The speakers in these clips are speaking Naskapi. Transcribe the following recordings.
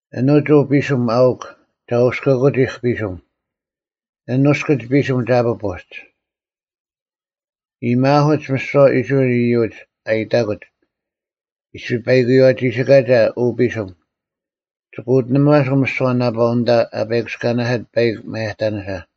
“ᐊᓄᒡ ᐅ ᐱᓯᒻ ᐊᐅᒄ ᒐ ᐅᔅᑭᑯᒋᐧᒄ ᐱᓯᒻ, ᐊᓐ ᐅᔅᑭᒡ ᐱᓯᒻ ᒐ ᐱᐳᒡ᙮ ᐃᔨᒪᐧᑯᒡ ᒥᓯᐛ ᐃᔅᕋᐃᓪ ᐃᔪᒡ, ᐊ ᐃᑕᑯᒡ, ᐃᔅᐱ ᐸᐃᑯᔪᐛ ᒋᓯᑲᒐ ᐅ ᐱᓯᒻ, ᒋᑭ ᐅᑎᓇᒪᓱᐤ ᒥᓯᐛ ᓇᐸᐤ ᐊᓐᑕ ᐊ ᐸᐃᑯᔅᑲᓇᓯᑦ ᐸᐃᒄ ᒪᔭᑕᓂᓯᓴ᙮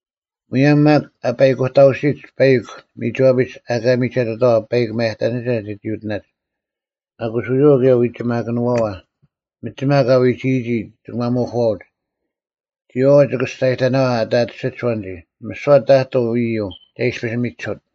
ᒧᔭᒻ ᒪᒃ ᐊ ᐸᐃᑯᑕᐅᓯᒡ ᐸᐃᒄ ᒥᒋᐛᐱᒡ ᐊᑲ ᒥᒐᑎᑥᐛ ᐸᐃᒄ ᒪᔭᑕᓂᓴ ᒐᒋ ᐅᑎᓇᒡ, ᐊᑯᔅ ᐎᔨᐛᐤ ᑭᔭ ᐎᒋᒪᑭᓄᐛᐛ ᒥᒋᒪ ᑲ ᐎᒋᔨᒋ ᒋᑭ ᒪᒧᐧᑯᐛᐅᒡ, ᒋᔨᐛᐤ ᒋᑭ ᒋᔅᒐᔨᑕᓇᐛᐤ ᐊ ᑕᑎᓯᒡ ᐊᐛᓐᒋ; ᒥᓯᐛ ᑕᑐᐤ ᐃᔪᐤ ᒐ ᐃᔅᐱᔅ ᒥᒋᓱᑦ᙮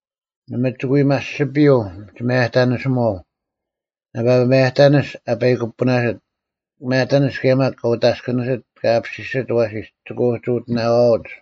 ᓇᒪ ᒋᑭ ᐎ ᒪᔅᒋᔪᐤ ᒋᒪᔭᑕᓂᓯᒧᐛᐤ, ᓇᐸ ᒪᔭᑕᓂᔅ ᐊ ᐸᐃᑯᐱᐳᓇᓯᑦ; ᒪᔭᑕᓂᔅ ᑭᔭ ᒪᒃ ᑲ ᐅᑦ ᐊᔅᑭᓂᓯᑦ ᑲ ᐊᐱᓯᓯᒡ ᐊᐛᓯᓯᒡ ᒋᑭ ᐅᒋ ᐅᑎᓇᐛᐅᒡ᙮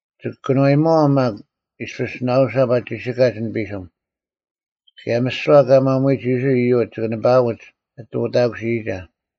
ᒋᑭ ᑭᓄᐛᔨᒪᐛᐤ ᒪᒃ ᐃᔅᐱᔅ ᓇᐅᓴᑉ ᐊ ᒋᓯᑲᒡ ᐊᓐ ᐱᓯᒻ: ᑭᔭ ᒥᓯᐛ ᑲ ᒪᒧᐎᒡ ᐃᔅᕋᐃᓪ ᐃᔪᒡ ᒋᑭ ᓂᐸᐊᐅᒡ ᐊᑎ ᐅᑕᑯᓯᔨᒐ᙮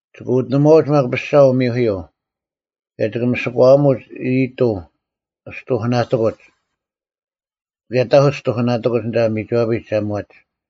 ᒋᑭ ᐅᑎᓂᒺᐅᒡ ᒪᒃ ᐱᔅᒐ ᐅᒥᐧᑯᔪᐤ, ᑭᔭ ᒋᑭ ᒥᓯᒂᐊᒧᒡ ᐊᔨᑐᐤ ᔅᑐᐧᑭᓇᑎᑯᒡ, ᑭᔭ ᑕᐧᑯᒡ ᔅᑐᐧᑭᓇᑎᑯᒡ ᐊᓐᑕ ᒥᒋᐛᐱᒡ ᒐ ᒧᐛᒡ᙮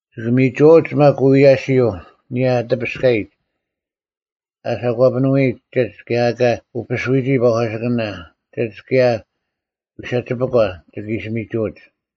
ᒋᑭ ᒥᒍᐛᐅᒡ ᒪᒃ ᐅᐎᔭᓯᔪᐤ ᐊᓂᔭ ᐊ ᑎᐱᔅᑲᔨᒡ; ᐊ ᓯᑭᑈᓄᐎᒡ ᒋᒡ ᑭᔭ ᐊᑲ ᐅᐱᓱᐎᔨᒋ ᐸᒂᓯᑭᓇ, ᒋᒡ ᑭᔭ ᐎᓴᒋᐸᒂ ᒋᑭ ᐃᓯ ᒥᒍᐅᒡ᙮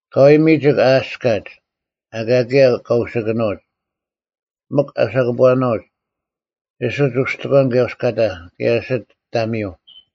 ᐊᑲᐎᔭ ᒥᒋᒄ ᐊ ᐊᔅᑲᒡ, ᐊᑲ ᑭᔭ ᑲ ᐅᓯᑭᓄᐅᒡ; ᒥᒄ ᐊ ᓴᑭᑈᓄᐅᒡ, ᐊᓯᒡ ᐅᔅᑎᒂᓐ ᑭᔭ ᐅᔅᑲᑕ, ᑭᔭ ᐊᓯᒡ ᑕᒥᔪᐤ᙮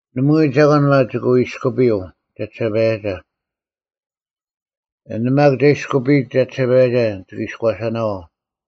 ᓇᒪᐎᔾ ᒐᒂᓐ ᒪᒃ ᒋᑭ ᐎᔅᑯᐱᔪᐤ ᒐᒋᓴᐸᔭᒐ: ᐊᓐ ᒪᒃ ᒐ ᐃᔅᑯᐱᔨᒡ ᒐᒋᓴᐸᔭᒐ, ᒋᑭ ᐃᔎᓴᓇᐛᐤ᙮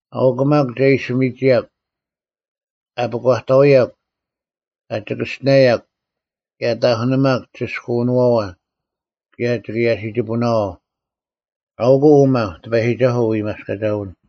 ᐊᐅᒄ ᒪᒃ ᒐ ᐃᓯ ᒥᒋᔭᒄ; ᐊ ᐱᒂᑕᐅᔭᒄ, ᐊ ᒋᑭᔅᒋᓇᔭᒄ, ᑭᔭ ᐊ ᑕᐧᑯᓂᒪᒄ ᒋᓯᔅᑲᐅᓄᐛᐛ: ᑭᔭ ᒋᑭ ᔭᓯᒋᐳᓇᐛᐤ; ᐊᐅᒄ ᐅᒪ ᑎᐸᔨᒋᒐᓱᐤ ᐅᐎᒪᔅᑲᒐᐎᓐ᙮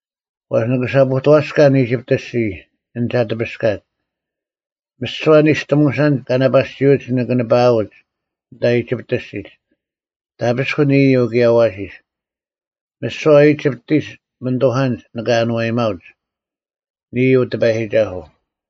ᐛᔅ ᓂᑭ ᓴᐳᑐᐛᔅᑲᓐ ᐃᒋᑉᑦ ᐊᔅᒋᔾ ᐊᓐ ᒐ ᑎᐱᔅᑲᒡ, ᒥᓯᐛ ᓂᔅᑎᒧᓴᓐᒡ ᑲ ᓇᐸᓯᐅᒡ ᓂᑭ ᓂᐸᐅᒡ ᐊᓐᑕ ᐃᒋᑉᑦ ᐊᔅᒋᒡ, ᑕᐱᔅᑯᓐ ᐃᔪᐤ ᑭᔭ ᐊᐛᓯᔅ᙮ ᒥᓯᐛ ᐃᒋᑉᑎᒡ ᒥᓂᑐᐧᑲᓐᒡ ᓂᑭ ᐊᓏᔨᒪᐅᒡ; ᓂᔾ ᐅ ᑎᐸᔨᒋᒐᓱᐤ᙮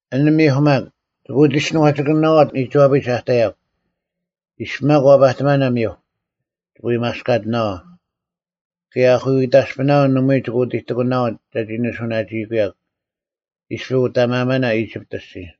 ᐊᓐ ᒥᐧᒄ ᒪᒃ ᒋᑭ ᐅᒋᔅᒋᓄᐛᒋᒋᑭᓂᓇᐛᐤ ᒥᒋᐛᐱᒡ ᐊ ᑕᔭᒄ: ᐃᔅᐱ ᒪᒃ ᐛᐸᑎᒪᓇ ᒥᐧᒄ, ᒋᑭ ᐎᒪᔅᑲᑎᓇᐛᐤ, ᑭᔭ ᐊᐧᑯᐃᑕᔅᐱᓇᐅᓐ ᓇᒪᐎᔾ ᒋᑭ ᐅᑎᑎᑯᓇᐛᐤ ᒐᒋ ᓂᓱᐅᓇᒋᐃᑯᔭᒄ, ᐃᔅᐱ ᐅᑕᒪᐊᒪᓇ ᐃᒋᑉᑦ ᐊᔅᒋᔾ᙮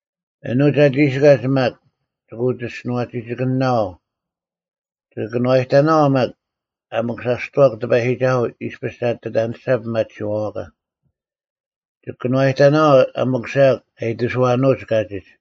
ᐊᓄᒡ ᐊ ᒋᓯᑲᒡ ᒪᒃ ᒋᑭ ᐅᒋᔅᒋᓄᐛᒋᒋᑭᓂᓇᐛᐤ; ᒋᑭ ᑭᓄᐛᔨᑕᓇᐛᐤ ᒪᒃ ᐊ ᒥᑯᓴᔅᑐᐛᒄ ᑎᐸᔨᒋᒐᓱᐤ ᐃᔅᐱᔅ ᒐ ᐊᑎ ᐊᔭᓂᔅᒐ ᐱᒪᑎᓯᐛᐛᒂ: ᒋᑭ ᑭᓄᐛᔨᑕᓇᐛᐤ ᐊ ᒥᑯᓴᔭᒄ ᐊ ᐃᑎᓱᐛᓄᐅᒡ ᑲᒋᒡ᙮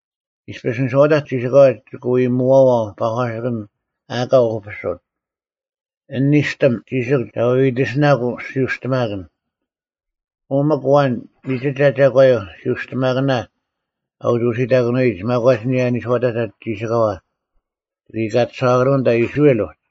ᐃᔅᐱᔅ ᓂᔄᐅᑕᒡ ᒋᓯᑲᐛ ᒋᑭ ᐎ ᒧᐛᐛᐤ ᐸᒂᓯᑭᓐ ᐊᑲ ᐅᐱᓱᑦ᙮ ᐊᓐ ᓂᔅᑎᒻ ᒋᓯᒄ ᒐ ᐎᐎᑎᓯᓇᒃ ᓯᐅᔅᑎᒪᑭᓐ, ᐅ ᒥᒄ ᐊᐛᓐ ᒥᒋᒐ ᒐᒂᔪᐤ ᓯᐅᔅᑎᒪᑭᓇ ᐊ ᐅᒋ ᐅᓯᑕᑭᓄᐎᒡ ᒪᒂᒡ ᐊᓂᔭ ᓂᔄᐅᑕᒡ ᒋᓯᒂ, ᒋ ᐃᑲᑎᓴᐛᑭᓄᐤ ᐊᓐᑕ ᐃᔅᕋᐃᓪ ᐅᒡ᙮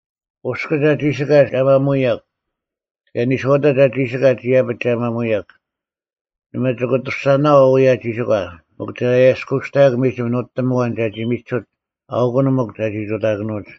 ᐅᔅᑭᒡ ᐊ ᒋᓯᑲᒡ ᒐ ᒪᒧᐎᔭᒃ, ᑭᔭ ᓂᔄᐅᑕᒡ ᐊ ᒋᓯᑲᒡ ᐃᔭᐱᒡ ᒐ ᒪᒧᐎᔭᒃ᙮ ᓇᒪ ᒋᑭ ᐊᑐᔅᒐᓄᐤ ᐅᔭ ᒋᓯᒂ, ᒥᒄ ᒐ ᐊᔭᔅᑯᔅᑕᔭᒄ ᒥᒋᒻ ᓄᑎᒻ ᐊᐛᓐ ᒐᒋ ᒥᒋᓱᑦ ᐊᐅᑯᓐ ᒥᒄ ᒐᒋ ᑐᑕᑭᓄᐅᒡ᙮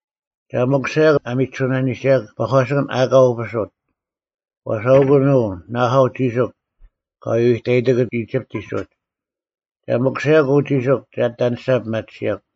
ᒐ ᒥᑯᓴᔭᒃ ᐊ ᒥᒋᓱᓇᓂᒐᔭᒃ ᐸᒂᓯᑭᓐ ᐊᑲ ᐅᐱᓱᑦ, ᐛᔅ ᐊᐅᑯᓐ ᐅ ᓇᐊᐤ ᒋᓯᒄ ᑲ ᐎᐎᑕᔨᑎᑯᒡ ᐃᒋᑉᑎᒡ ᐅᒡ᙮ ᒐ ᒥᑯᓴᔭᒄ ᐅ ᒋᓯᒄ ᒐ ᐊᑎ ᐊᓂᔅᒐ ᐱᒪᑎᓯᔭᒄ᙮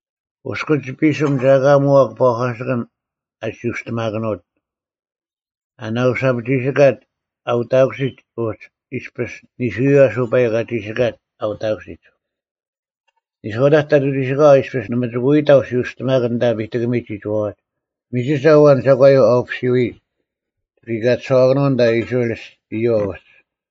ᐅᔅᑭᒡ ᐱᓯᒻ ᒐ ᐊᑲ ᒧᐛᒄ ᐸᒂᓯᑭᓐ ᐊᓯᐅᔅᑎᒪᑭᓄᐅᑦ, ᐊ ᓇᐅᓴᑉ ᒋᓯᑲᒡ ᐊ ᐅᑕᑯᓯᒡ ᐅᒡ ᐃᔅᐱᔅ ᓂᓱᔪᐤ ᐊᓱ ᐸᐃᒄ ᐊ ᒋᓯᑲᒡ ᐊ ᐅᑕᑯᓯᒡ᙮ ᓂᔄᐅᑕᒡ ᑕᑐ ᒋᓯᑲᐛ ᐃᔅᐱᔅ ᓇᒪ ᒋᑭ ᐎ ᑕᐤ ᓯᐅᔅᑎᒪᑭᓐ ᐊᓐᑕ ᐱᑎᑭᒥᒡ ᒋᒋᐛᐛᒡ᙮ ᒥᒋᒐ ᐊᐛᓐ ᒐᒂᔪᐤ ᐊ ᐅᐱᓯᔪᐎᒡ, ᒋᑭ ᐃᑲᑎᓴᐛᑭᓄᐤ ᐊᓐᑕ ᐃᔅᕋᐃᓪ ᐃᔪᐛ ᐅᒡ᙮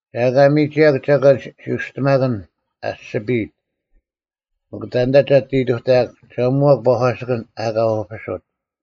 ᒐ ᐊᑲ ᒥᒋᔭᒄ ᒐᒂᓐ ᓯᐅᔅᑎᒪᑭᓐ ᐊᔅᒋᐱᔨᑦ᙮ ᒥᒄ ᑕᓐᑕ ᒐ ᐊᑎ ᐃᑕᔭᒃ, ᒐ ᒧᐛᒃ ᐸᒂᓯᑭᓐ ᐊᑲ ᐅᐱᓱᑦ᙮”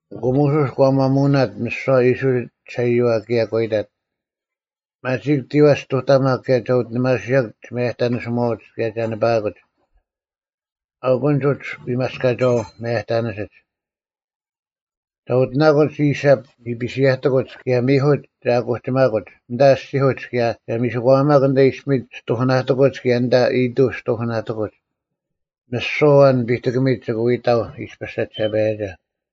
ᐊᑯ ᒧᓱᔅ ᒂ ᒪᒧᐅᓇᑦ ᒥᓯᐛ ᐃᔅᕋᐃᓪ ᒋᓴᐃᔪᐛ ᑭᔭ ᒂ ᐃᑕᑦ, “ᒪᒋᒃ ᑎᐛᒡ ᔅᑐᑕᒪᒃ ᑭᔭ ᒐ ᐅᑎᓂᒪᓱᔭᒄ ᒋᒪᔭᑕᓂᓯᒧᐛᐅᒡ ᑭᔭ ᒐ ᓂᐸᐊᑯᒡ᙮ ᐊᐅᑯᓐᒡ ᐅᒡ ᐎᒪᔅᑲᒐᐅ ᒪᔭᑕᓂᓯᒡ᙮ ᒐ ᐅᑎᓇᑯᒡ ᐃᓴᑉ ᓂᐱᓯᔭᑎᑯᒡ ᑭᔭ ᒥᐧᑯᒡ ᒐ ᑯᒋᒪᑯᒡ ᐊᓐᑕ ᐊᔅᒋᐧᑯᒡ ᑭᔭ ᒐ ᒥᓯᒂᐊᒪᒄ ᐊᓐᑕ ᐃᔅᐱᒥᒡ ᔅᑐᐧᑭᓇᑎᑯᒡ ᑭᔭ ᐊᓐᑕ ᐊᔨᑐᐤ ᔅᑐᐧᑭᓇᑎᑯᒡ᙮ ᒥᓯᐛ ᐊᐛᓐ ᐱᑎᑭᒥᒡ ᒋᑭ ᐎ ᑕᐤ ᐃᔅᐱᔅ ᒐᒋᓴᐸᔭᒐ᙮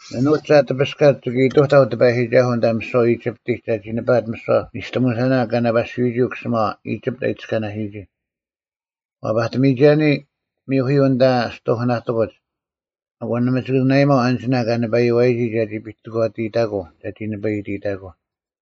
ᐊᓄᒡ ᒐ ᑎᐱᔅᑲᒡ ᒋᑭ ᐃᑐᑕᐤ ᑎᐸᔨᒋᒐᓱᐤ ᐊᓐᑕ ᒥᓯᐛ ᐃᒋᑉᑎᒡ ᒐᒋ ᓂᐸᐊᑦ ᒥᓯᐛ ᓂᔅᑎᒧᓴᓇ ᑲ ᓇᐸᓯᔪᐎᔨᒋ ᐅᑯᓯᒪᐛ ᐃᒋᑉᑦ ᐊ ᐃᑎᔅᑲᓇᓯᔨᒋ, ᐛᐸᑎᒥᔨᒐᓂ ᒥᐧᑯᔪᐤ ᐊᓐᑕ ᔅᑐᐧᑭᓇᑎᑯᒡ ᐊᑯ ᓇᒪ ᒋᑭ ᓇᐊᔨᒪᐤ ᐊᓐᒋᓇ ᑲ ᓂᐸᔪᐛᔨᒋ ᒐᒋ ᐱᑎᒂᑎᔨᑕᑯᐤ ᒐᒋ ᓂᐸᐃᑎᑕᑯᐤ᙮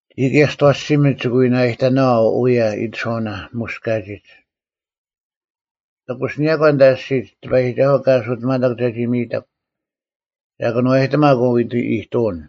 ᒋᔾ ᑭᔭ ᒋᑦ ᐊᐛᓯᒥᒡ ᒋᑭ ᐎ ᓇᔨᑕᓇᐛᐤ ᐅᔭ ᐃᑎᓱᐛᐅᓇ ᒧᔅ ᑲᒋᒡ᙮ ᑎᑯᓯᓂᔭᒂ ᐊᓐᑕ ᐊᔅᒋᒡ ᑎᐸᔨᒋᒐᓱᐤ ᑲ ᐊᓱᑎᒪᑕᒄ ᒐᒋ ᒥᔨᑕᒄ, ᒐ ᑭᓄᐛᔨᑎᒪᒄ ᐅ ᐃᑐᐅᓐ᙮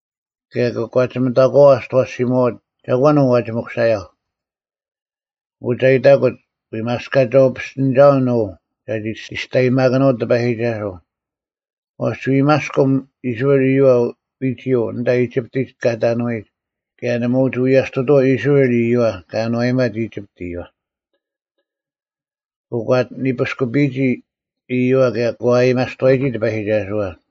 ᑭᔭ ᑭ ᑯᒂᒋᒥᑕᒂᐛ ᒋᑦ ᐊᐛᓯᒧᐛᐅᒡ, ‘ᒐᒂᓐ ᐅ ᐛᒋ ᒥᑯᓴᔭᐧᒄ?’ ᐊᑯ ᒐ ᐃᑕᑯᒡ, ‘ᐎᒪᔅᑲᒐᐅ ᐱᔅᑎᓂᒐᐅᓐ ᐅ ᒐᒋ ᒋᔅᑕᔨᒪᑭᓄᐅᑦ ᑎᐸᔨᒋᒐᓱᐤ, ᐛᔅ ᒋ ᐎᒪᔅᑭᒻ ᐃᔅᕋᐃᓪ ᐃᔪᐛ ᐎᒋᔪᐤ ᐊᓐᑕ ᐃᒋᑉᑎᒡ ᑲ ᑕᓄᐎᒡ ᑭᔭ ᓇᒪ ᐅᒋ ᐎᔭᔅᑐᑐᐛᐤ ᐃᔅᕋᐃᓪ ᐃᔪᐛ ᑲ ᐊᓏᔨᒪᑦ ᐃᒋᑉᑦ ᐃᔪᐛ᙮’” ᐊᑯ ᒂ ᐊᑎ ᓂᐱᔅᑯᐱᒋ ᐃᔪᐛ ᑭᔭ ᒂ ᐊᔭᒥᐊᒪᔅᑐᐛᔨᒋ ᑎᐸᔨᒋᒐᓱᐛ᙮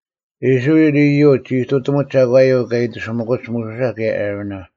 ᐃᔅᕋᐃᓪ ᐃᔪᒡ ᒋ ᐃᑐᑎᒧᒡ ᒐᒂᔪᐤ ᑲ ᐃᑎᓯᒥᑯᒡ ᒧᓱᓴ ᑭᔭ ᐊᕋᓇ᙮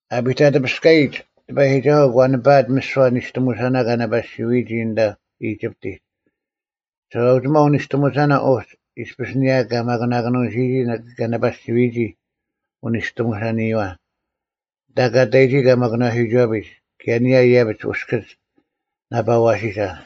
ᐊᐱᑕᑎᐱᔅᑲᔨᒡ ᑎᐸᔨᒋᒐᓱᐤ ᒂ ᓂᐸᐊᑦ ᒥᓯᐛ ᓂᔅᑎᒧᓴᓇ ᑲ ᓇᐸᓯᔪᐎᒋ ᐊᓐᑕ ᐃᒋᑉᑎᒡ, ᒋᓴᐅᒋᒪᐤ ᐅᓂᔅᑎᒧᓴᓇ ᐅᒡ ᐃᔅᐱᔅ ᐊᓂᔭ ᑲ ᒪᑯᓇᑭᓄᓯᔨᒋ ᑲ ᓇᐸᓯᔪᐎᒋ ᐅᓂᔅᑎᒧᓴᓂᔪᐛ, ᐊᓐᑕ ᑲ ᑕᔨᒋ ᑲᒪᑯᓄᐛᓯᐅᒋᐛᐱᒡ, ᑭᔭ ᐊᓂᔭ ᐃᔭᐱᒡ ᐅᔅᑭᒡ ᓇᐸ ᐊᐛᓯᓴ᙮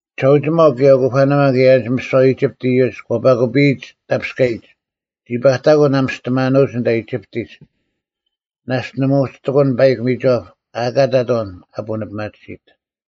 ᒋᓴᐅᒋᒪᐤ ᑭᔭ ᐅᑯᐸᓇᒪ ᑭᔭ ᐊᓐᒡ ᒥᓯᐛ ᐃᒋᑉᑦ ᐃᔪᒡ ᒂ ᐸᑯᐱᔨᒡ ᑕᐱᔅᑲᔨᒡ, ᒋ ᐸᑕᑯᓐ ᐊ ᒥᔅᑎᒪᓄᐅᒡ ᐊᓐᑕ ᐃᒋᑉᑎᒡ, ᓇᔅᒡ ᓇᒪ ᐅᒋ ᑎᑯᓐ ᐸᐃᒄ ᒥᒋᐛᑉ ᐊ ᐊᑲ ᑕᑦ ᐊᐛᓐ ᐊ ᐳᓂᐱᒪᑎᓯᑦ᙮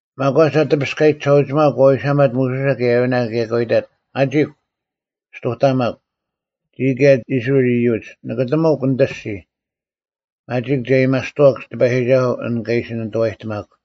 ᒪᒂᒡ ᐊ ᑎᐱᔅᑲᔨᒡ ᒋᓴᐅᒋᒪᐤ ᒂ ᐎᓴᒪᑦ ᒧᓱᓴ ᑭᔭ ᐊᕋᓇ ᑭᔭ ᒂ ᐃᑕᑦ, “ᒪᒋᒃ! ᔅᑐᑕᒪᒃ, ᒋᔾ ᑭᔭ ᐃᔅᕋᐃᓪ ᐃᔪᒡ! ᓂᑭᑎᒥᒄ ᓂᑦ ᐊᔅᒋᔾ᙮ ᒪᒋᒃ, ᒐ ᐊᔭᒥᐊᔅᑐᐛᒄ ᑎᐸᔨᒋᒐᓱᐤ ᐊᓐ ᑲ ᐃᓯ ᓂᑐᐛᔨᑎᒪᒃ᙮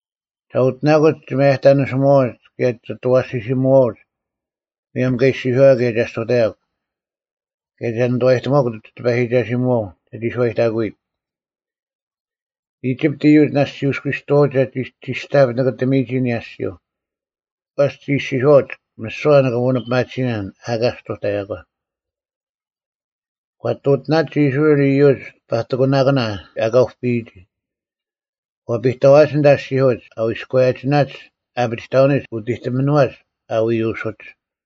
ᒐ ᐅᑎᓇᑯᒡ ᒋ ᒪᔭᑕᓂᓯᒧᐛᐅᒡ ᑭᔭ ᒋᑦ ᐊᐛᓯᓯᒧᐅᒡ, ᒧᔭᒻ ᑲ ᐃᔅᒋᔄᔭᒄ ᑭᔭ ᒐ ᔅᑐᑕᔭᒃ᙮ ᑭᔭ ᒐ ᓂᑐᐛᔨᑎᒧᐛᒄ ᒋ ᑎᐸᔨᒋᒐᓯᒧᐛᐤ ᒐᒋ ᓱᐛᔨᑕᑯᔨᑦ᙮” ᐃᒋᑉᑦ ᐃᔪᒡ ᓇᔅᒡ ᒋ ᐅᔅᑯᐎᔅᑐᐛᐅᒡ ᒐᒋ ᒋᔅᑕᑉ ᓂᑭᑎᒥᔨᒋ ᐊᓂᔭ ᐊᔅᒋᔪᐤ᙮ ᐛᔅ ᒋ ᐃᔅᒋᔄᐅᒡ, “ᒥᓯᐛ ᓂᑭ ᐳᓂᐱᒪᑎᓯᓇᓐ ᐊ ᐊᑲ ᔅᑐᑕᔭᒂ” ᒂ ᐊᑎ ᐅᑎᓇᒡ ᐃᔅᕋᐃᓪ ᐃᔪᒡ ᐸᑎᑯᓇᑭᓇ ᐊᑲ ᐅᐱᔨᒋ, ᒂ ᐱᑕᐛᒡ ᐊᓐᑕ ᐊᔅᒋᐧᑯᒡ ᐊ ᐎᔎᔭᒋᓇᒡ ᐊᐱᒋᑕᐅᓂᒡ ᐅᑎᑎᒥᓄᐛᒡ ᐊ ᐎᐅᓯᒡ᙮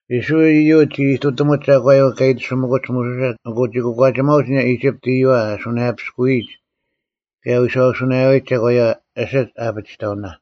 ᐃᔅᕋᐃᓪ ᐃᔪᒡ ᒋ ᐃᑐᑎᒧᒡ ᒐᒂᔪᐤ ᑲ ᐃᑎᓯᒥᑯᒡ ᒧᓱᓴ ᐊᑯ ᒋ ᑯᒂᒋᒪᐅᒡ ᐊᓂᔭ ᐃᒋᑉᑦ ᐃᔪᐛ ᐊ ᓱᓇᔭᐱᔅᑯᔨᒡ ᑭᔭ ᐊ ᐎᓴᐅᓱᓇᔭᐎᒡ ᒐᒂᔪᐛ, ᐊᓯᒡ ᐊᐱᒋᑕᐅᓇ᙮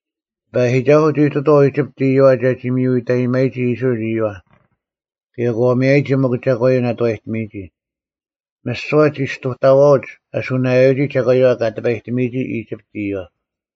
ᑎᐸᔨᒋᒐᓱᐤ ᒋ ᐃᑐᑐᐛᐤ ᐃᒋᑉᑦ ᐃᔪᐛ ᒐᒋ ᒥᔪᐃᑕᔨᒪᔨᒋ ᐃᔅᕋᐃᓪ ᐃᔪᐛ, ᑭᔭ ᒂ ᒥᔭᔨᒋ ᒥᒄ ᒐᒂᔪᐤ ᓇᑐᐛᔨᑎᒥᒋ, ᒥᓯᐛ ᒋ ᔅᑐᑕᐛᐅᒡ ᐊᓱᓇᔭᐎᒋ ᒐᒂᔪᐛ ᑲ ᑎᐸᔨᑎᒥᔨᒋ ᐃᒋᑉᑦ ᐃᔪᐛ᙮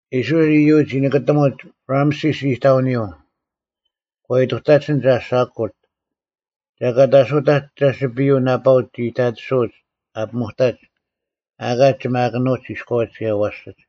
ᐃᔅᕋᐃᓪ ᐃᔪᒡ ᒋ ᓂᑭᑎᒧᒡ ᕋᒪᓯᔅ ᐃᑕᐅᓂᔪᐤ ᒂ ᐃᑐᑕᒡ ᐊᓐᑕ ᓱᑯᑦ᙮ ᒐᑲᑦ ᐊᓱᑕᒡ ᒐᓯᐱᔪᐤ ᓇᐸᐅᒡ ᒋ ᐃᑕᑎᓱᐅᒡ ᐊ ᐱᒧᑕᒡ, ᐊᑲ ᒋᒪᑭᓄᐅᒡ ᐃᔎᐅᒡ ᑭᔭ ᐊᐛᓯᒡ᙮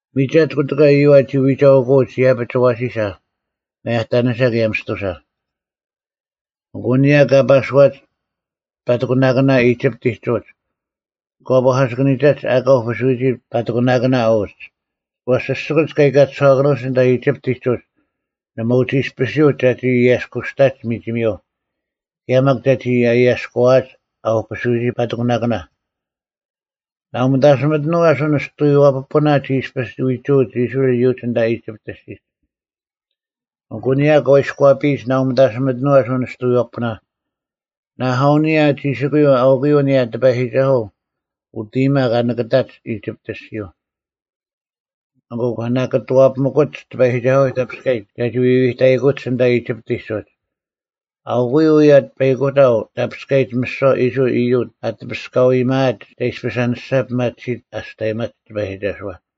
ᒥᒐᑦ ᑯᑎᑲ ᐃᔪᐛ ᒋ ᐎᒐᐅᑯᐅᒡ ᐃᔭᐱᒡ ᐊᐛᓯᓴ, ᒪᔭᑕᓂᓴ ᑭᔭ ᒥᔅᑐᓴ᙮ ᐊᑯ ᐊᓂᔭ ᑲ ᐸᓱᐛᒡ ᐸᑎᑯᓇᑭᓇ ᐃᒋᑉᑎᒡ ᐅᒡ, ᒂ ᐸᒂᓯᑭᓂᒐᒡ ᐊᑲ ᐅᐱᓱᔨᒋ ᐸᑎᑯᓇᑭᓇ ᐅᒡ᙮ ᐛᔅ ᓯᔅᒋᑯᒡ ᑲ ᐃᑲᑎᓴᐛᑭᓄᐅᒡ ᐊᓐᑕ ᐃᒋᑉᑎᒡ ᐅᒡ ᓇᒪ ᐅᒋ ᐃᔅᐱᓯᔪᐅᒡ ᒐᒋ ᐃᔭᔅᑯᔅᑕᒡ ᒥᒋᒥᔪᐤ ᑭᔭ ᒪᒃ ᒐᒋ ᐊᔭᔅᑯᐛᐊᒡ ᐊ ᐅᐱᓱᔨᒋ ᐸᑎᑯᓇᑭᓇ᙮ ᓇᐤ ᒥᑕᓯᒥᑎᓄᐤ ᐊᓱ ᓂᔅᑐᔪᐛ ᐱᐳᓇ ᒋ ᐃᔅᐱᔅ ᐎᒍᐅᒡ ᐃᔅᕋᐃᓪ ᐃᔪᒡ ᐊᓐᑕ ᐃᒋᑉᑦ ᐊᔅᒋᒡ᙮ ᐊᑯ ᐊᓂᔭ ᑲ ᐃᔎᐱᔨᒡ ᓇᐤ ᒥᑕᓯᒥᑎᓄᐤ ᐊᓱ ᓂᔅᑐᔪᐛ ᐱᐳᓇ, ᓇᐊᐤ ᐊᓂᔭ ᒋᓯᑯᔪᐤ ᐊᐅᑯᔪᐤ ᐊᓂᔭ ᑎᐸᔨᒋᒐᓱᐤ ᐅᑦ ᐃᔨᒪ ᑲ ᓂᑭᑕᒡ ᐃᒋᑉᑦ ᐊᔅᒋᔪᐤ᙮ ᐊᑯ ᒂ ᓇᑭᑐᐛᐱᒥᑯᒡ ᑎᐸᔨᒋᒐᓱᐛ ᑕᐱᔅᑲᔨᒡ ᒐᒋ ᐎᐎᑕᐃᑯᒡ ᐊᓐᑕ ᐃᒋᑉᑎᒡ ᐅᒡ, ᐊᐅᑯᔪᐤ ᐅᔭ ᐸᐃᑯᑕᐤ ᑕᐱᔅᑲᔨᒡ ᒥᓯᐛ ᐃᔅᕋᐃᓪ ᐃᔪᒡ ᐊ ᑎᐱᔅᑲᐤ ᐊᔭᒥᐊᒡ ᒐ ᐃᔅᐱᔅ ᐊᓂᔅᒐ ᐱᒪᑎᓯᒡ ᐊᔅᑕᔨᒪᒡ ᑎᐸᔨᒋᒐᓱᐛ᙮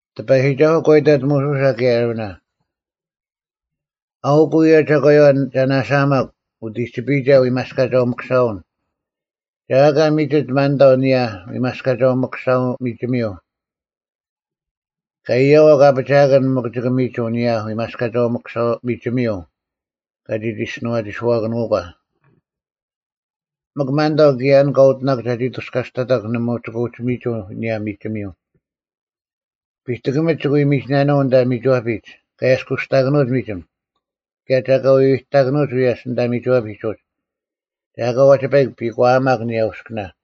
ᑎᐸᔨᒋᒐᓱᐤ ᒂ ᐃᑕᑦ ᒧᓱᓴ ᑭᔭ ᐊᕋᓇ, “ᐊᐅᑯᐤ ᐅᔭ ᒐᒂᔪᐛ ᒐ ᓇᓴᐊᒪᒄ ᐅᑎᒋᐱᔨᒐ ᐎᒪᔅᑲᒐᐅ-ᒥᑯᓴᐅᓐ: ᒐ ᐊᑲ ᒥᒋᑦ ᒪᓐᑕᐤ ᐊᓂᔭ ᐎᒪᔅᑲᒐᐅ-ᒥᑯᓴᐅ-ᒥᒋᒥᔪᐤ᙮ ᑲ ᐃᔭᐛᒄ ᐊᐱᒋᐊᑭᓐ ᒋᑭ ᒋ ᒥᒍᐤ ᐊᓂᔭ ᐎᒪᔅᑲᒐᐅ-ᒥᑯᓴᐅ-ᒥᒋᒥᔪᐤ ᑲᒋ ᒋᔅᒋᓄᐛᒋᔄᑭᓄᒂ, ᒥᒄ ᒪᓐᑕᐤ ᑭᔭ ᐊᓐ ᑲ ᐅᑎᓇᒄ ᒐᒋ ᐊᑐᔅᑲᔅᑕᑕᒄ ᓇᒪ ᒋᑭ ᐅᒋ ᒥᒋᐤ ᐊᓂᔭ ᒥᒋᒥᔪᐤ᙮ ᐱᑎᑭᒥᒡ ᒋᑭ ᐎ ᒥᒋᓇᓄᐤ ᐊᓐᑕ ᒥᒋᐛᐱᒡ ᑲ ᐊᔭᔅᑯᔅᑕᑭᓄᐅᒡ ᒥᒋᒻ; ᑭᔭ ᒐ ᐊᑲ ᐎᐎᑕᑭᓄᐅᒡ ᐎᔭᔅ ᐊᓐᑕ ᒥᒋᐛᐱᒡ ᐅᒡ, ᒐ ᐊᑲ ᐛᒋ ᐸᐃᒄ ᐱᒂᐊᒪᒄ ᐊᓂᔭ ᐅᔅᑭᓇ᙮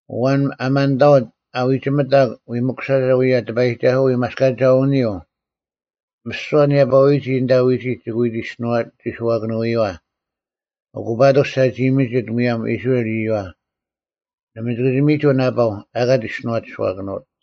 ᐊᐛᓐ ᐊ ᒪᓐᑕᐅᑦ ᐊ ᐎᒋᒥᑕᒄ ᐎ ᒥᑯᓴᒐ ᐅᔭ ᑎᐸᔨᒋᒐᓱᐛ ᐎᒪᔅᑲᒐᐅᓂᔪᐤ, ᒥᓯᐛ ᓂᔭᐸᐅᐎᔨᒋ ᐊᓐᑕ ᐎᒋᒡ ᒋᑭ ᐎ ᒋᔅᒋᓄᐛᒋᔄᑭᓄᐎᔪᐛ; ᐊᑯ ᐸᑐᔅ ᒐᒋ ᒥᒋᑦ ᒧᔭᒻ ᐃᔅᕋᐃᓪ ᐃᔪᐛ᙮ ᓇᒪ ᒋᑭ ᒥᒍᐤ ᓇᐸᐤ ᐊᑲ ᒋᔅᒋᓄᐛᒋᔄᑭᓄᐅᑦ᙮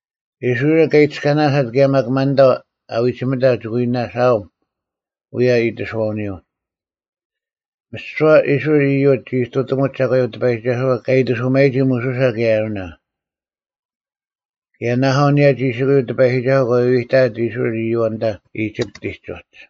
ᐃᔅᕋᐃᓪ ᑲ ᐃᑎᔅᑲᓇᓯᑦ ᑭᔭ ᒪᒃ ᒪᓐᑕᐤ ᐊ ᐎᒋᒥᑕᒄ ᒋᑭ ᐎ ᓇᓴᐊᒻ ᐅᔭ ᐃᑎᓱᐛᐅᓂᔪᐤ᙮” ᒥᓯᐛ ᐃᔅᕋᐃᓪ ᐃᔪᒡ ᒋ ᐃᑐᑎᒧᒡ ᒐᒂᔪᐤ ᑎᐸᔨᒋᒐᓱᐛ ᑲ ᐃᑎᓱᒪᔨᒋ ᒧᓱᓴ ᑭᔭ ᐊᕋᓇ᙮ ᑭᔭ ᓇᐊᐤ ᐊᓂᔭ ᒋᓯᑯᔪᐤ ᑎᐸᔨᒋᒐᓱᐤ ᒂ ᐎᐎᑕᐊᑦ ᐃᔅᕋᐃᓪ ᐃᔪᐛ ᐊᓐᑕ ᐃᒋᑉᑎᒡ ᐅᒡ᙮